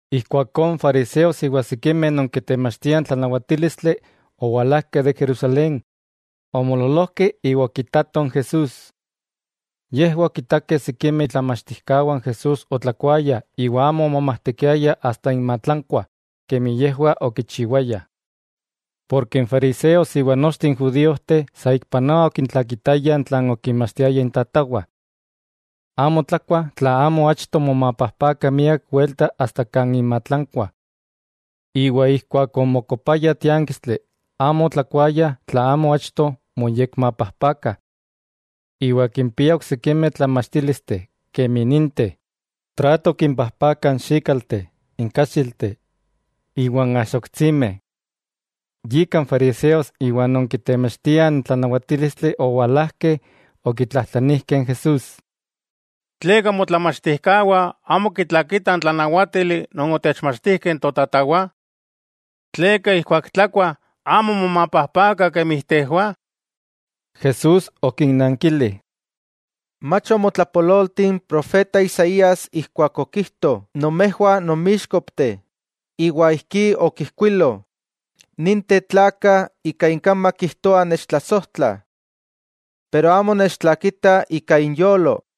Ijkuakó n fariseos iwa sikimeh non kitemachtiah n tlanawatílistli owalajkeh de Jerusalén, omoololojkeh iwa okitatoh n Jesús. Yejwah okitakeh sikimeh itlamachtijkawah n Jesús otlakuayah iwa amo omomajtekiayah asta inmatlankwah kemi yejwah okichiwayah. Porke n fariseos iwa nochteh n judíojteh saikpanoa okitlakitayah tlan okinmachtijkah intatawah. Amo tlakuah tla amo achto momapajpakah miak welta asta kan inmatlankwah. Keman onmokopayah tiánkistli, amo otlakuayah tla amo achto moyekmapajpakah. Iwa kimpiah oksikimeh tlamachtílisteh, kemi ninteh: trato kimpajpakah n xíkalteh, n káxilteh, iwa n axoktsimeh. Yika n fariseos iwa non kitemachtiah n tlanawatílistli owalajkeh okitlajtlanijkeh n Jesús: —¿Tleka motlamachtijkawah amo kitlakitah n tlanáwatili non otechmachtijkeh totatawah? ¿Tleka ijkuak tlakuah amo momapajpakah kemi tejwah? Jesús okinnankili: —Mach omotlapololti n profeta Isaías ijkuak okijto nomejwah nonmíxkopteh, iwa ijkí okijkuilo: Ninteh tlakah ika inkamak kijtoah nechtlasojtlah. Pero amo nechtlakitah ika inyolo.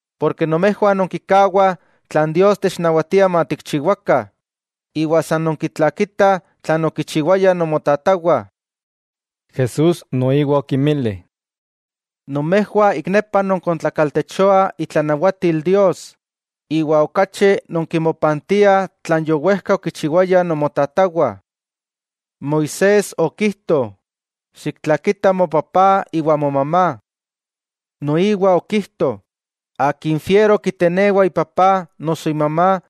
Porke nomejwah nonkikawah tlan Dios technawatia matikchiwakah iwa san nonkitlakitah tlan okichiwayah nomotatawah. Jesús noiwa okinmili: —Nomejwah ik nepa nonkontlakaltechoah itlanawatil Dios, iwa okachi nonkimopantiah tlan yowejka okichiwayah nomotatawah. Moisés okijto: “Xiktlakita mopapá iwa momamá.” Noiwa okijto: “Akin fiero kitenewa ipapá noso imamá,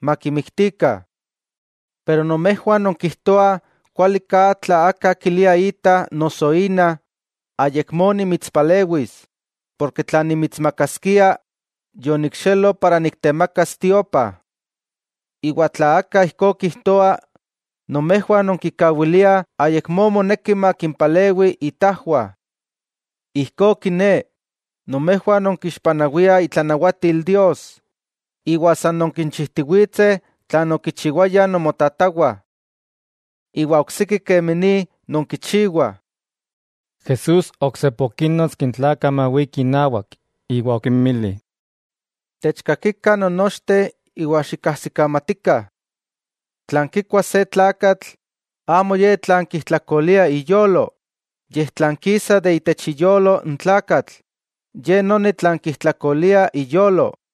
makimiktikah.” Pero nomejwah nonkijtoah kualiká tla aka kilia ita noso ina: “Ayakmó nimitspalewis, porke tlan nimitsmakaskia yonikxelo para niktemakas tiopa.” Iwa tla aka ijkó kijtoa, nomejwah nonkikawiliah ayakmó moneki makimpalewi itajwah. Ijkó kiné, nomejwah nonkixpanawiah itlanawatil Dios, iwa san nonkinchijtiwitseh tlan okichiwayah nomotatawah. Iwa oksiki kemi ni, nonkichiwah. Jesús oksepa okínnotski n tlakah mawikih inawak, iwa okinmili: —Techkakikah non nochteh iwa xikajsikamatikah: Tlan kikua se tlakatl, amo ye tlan kijtlakolia iyolo, yej tlan kisa de itech iyolo n tlakatl, ye noni tlan kijtlakolia iyolo.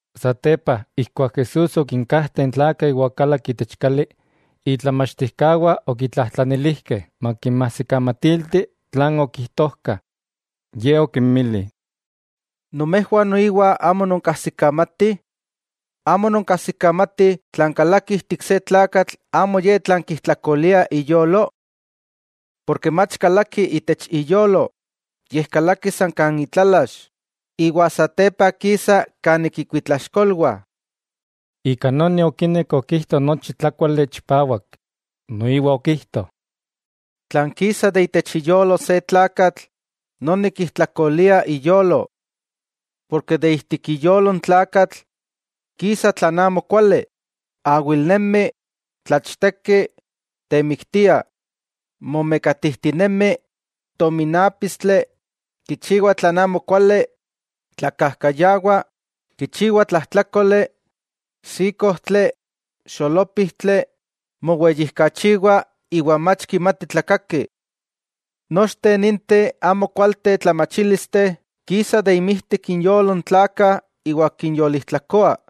Satepa, ijkuak Jesús okinkajteh n tlakah iwa okalak itech kali, itlamachtijkawah okitlajtlanilijkeh makinmajsikamatilti tlan okijtojka. Ye okinmili: —¿Nomejwah noiwa amo nonkajsikamatih? ¿Amo nonkajsikamatih tlan kalaki ijtik se tlakatl amo ye tlan kijtlakolia iyolo? Porke mach kalaki itech iyolo, yej kalaki san kan itlalax, iwa satepa kisa kanik ikuitlaxkolwah. Ika noni okinek okijto nochi tlákuale chipawak. Noiwa okijto: —Tlan kisa ijtik iyolo se tlakatl, noni kijtlakolia iyolo. Porke de ijtik iyolo n tlakatl, kisa tlan amo kuali, awilnemi, tlachteki, temiktia, momekatijtinemi, tominápistli, kichiwa tlan amokuali, tlakajkayawa, kichiwa tlajtlákoli, xíkojtli, xolópijtli, moweyijkachiwa iwa mach kimati tlakaki. Nochteh ninteh amo kualteh tlamachílisteh kisah inmijtik inyolo n tlakah iwa kinyolijtlakoa.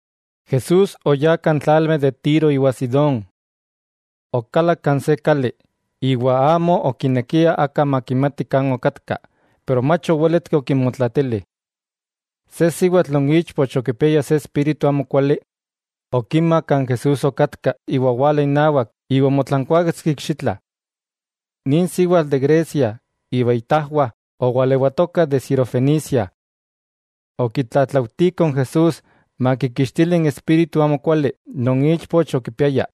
Jesús oyá kan tlalmeh de Tiro iwa Sidón. Okalak kan se kali, iwa amo okinekia aka makimati kan okatka, pero mach owéletki okinmotlatili. Se siwatl non ichpoch okipiaya se espíritu amokuali, okima kan Jesús okatka iwa owala inawak iwa omotlankuáketski ikxitla. Nin siwatl de Grecia iwa itajwah owalewatokah de sirofenicia. Okitlatlaujtiko n Jesús makikixtili n espíritu amokuali non ichpoch okipiaya.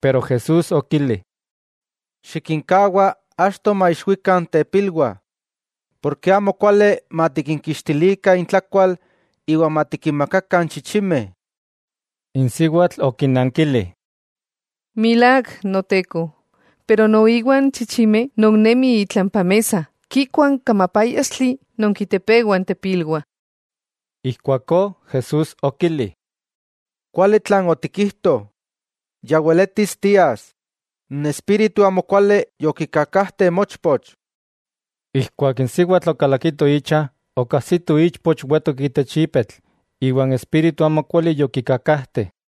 Pero Jesús okili: —Xikinkawa achto maixwikah n tepilwah, porke amo kuali matikinkixtilikah intlakual iwa matikinmakakah n chichimeh. N siwatl okinankili: —Milák, Noteko, pero noiwa n chichimeh non nemih itlampa mesa kikuah n kamapáyaxtli non kitepewah n tepilwah. Ijkuakó Jesús okili: —Kuali tlan otikijto, ya weletis tias. N espíritu amokuali yokikakajte mochpoch. Ijkuak n siwatl okalakito icha, okajsito ichpoch wetok itech ipetl, iwa n espíritu amokuali yokikakajte.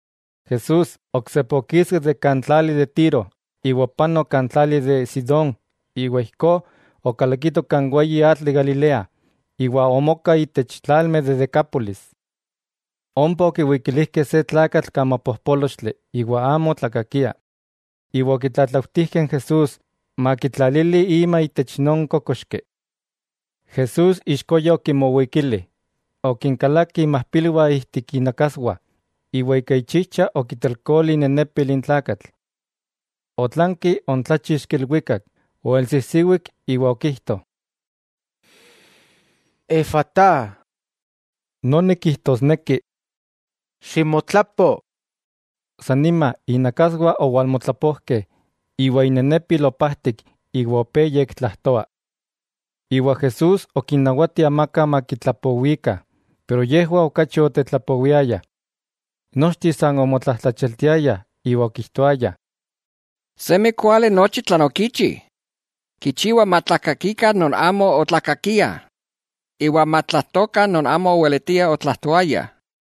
Jesús, oksepa okiski de kan tlali de Tíro, iwa opanok kan tlali de Sidón iwa ijkó okalakito kan weyi atl de Galilea, iwa omoka itech tlalmeh de Decápolis. Ompa okiwikilijkeh se tlakatl kamapojpólochtli iwa amo otlakakia, iwa okitlatlautijkeh n Jesús makitlalili ima itech non kókoxki. Jesús ixkoya okimowikili, okinkalaki imajpilwah ijtik inakaswah, iwa ika ichijcha okitelkoli inenepil n tlakatl. Otlanki oontláchixki ilwikak, oelsijsiwik iwa okijto: —¡Efatá! —noni kijtosneki: ¡Ximotlapo! San nima, inakaswah owalmotlapojkeh, iwa inenepil opajtik iwa opé yektlajtoa. Iwa Jesús okinnawati amaka makitlapowikah, pero yejwah okachi otetlapowiayah. Nochteh san omotlajtlachialtiayah iwa okijtoayah: —Semi kuali nochi tlan okichi, kichiwa matlakakikah non amo otlakakiah, iwa matlajtokah non amo oweletiah otlajtoaya.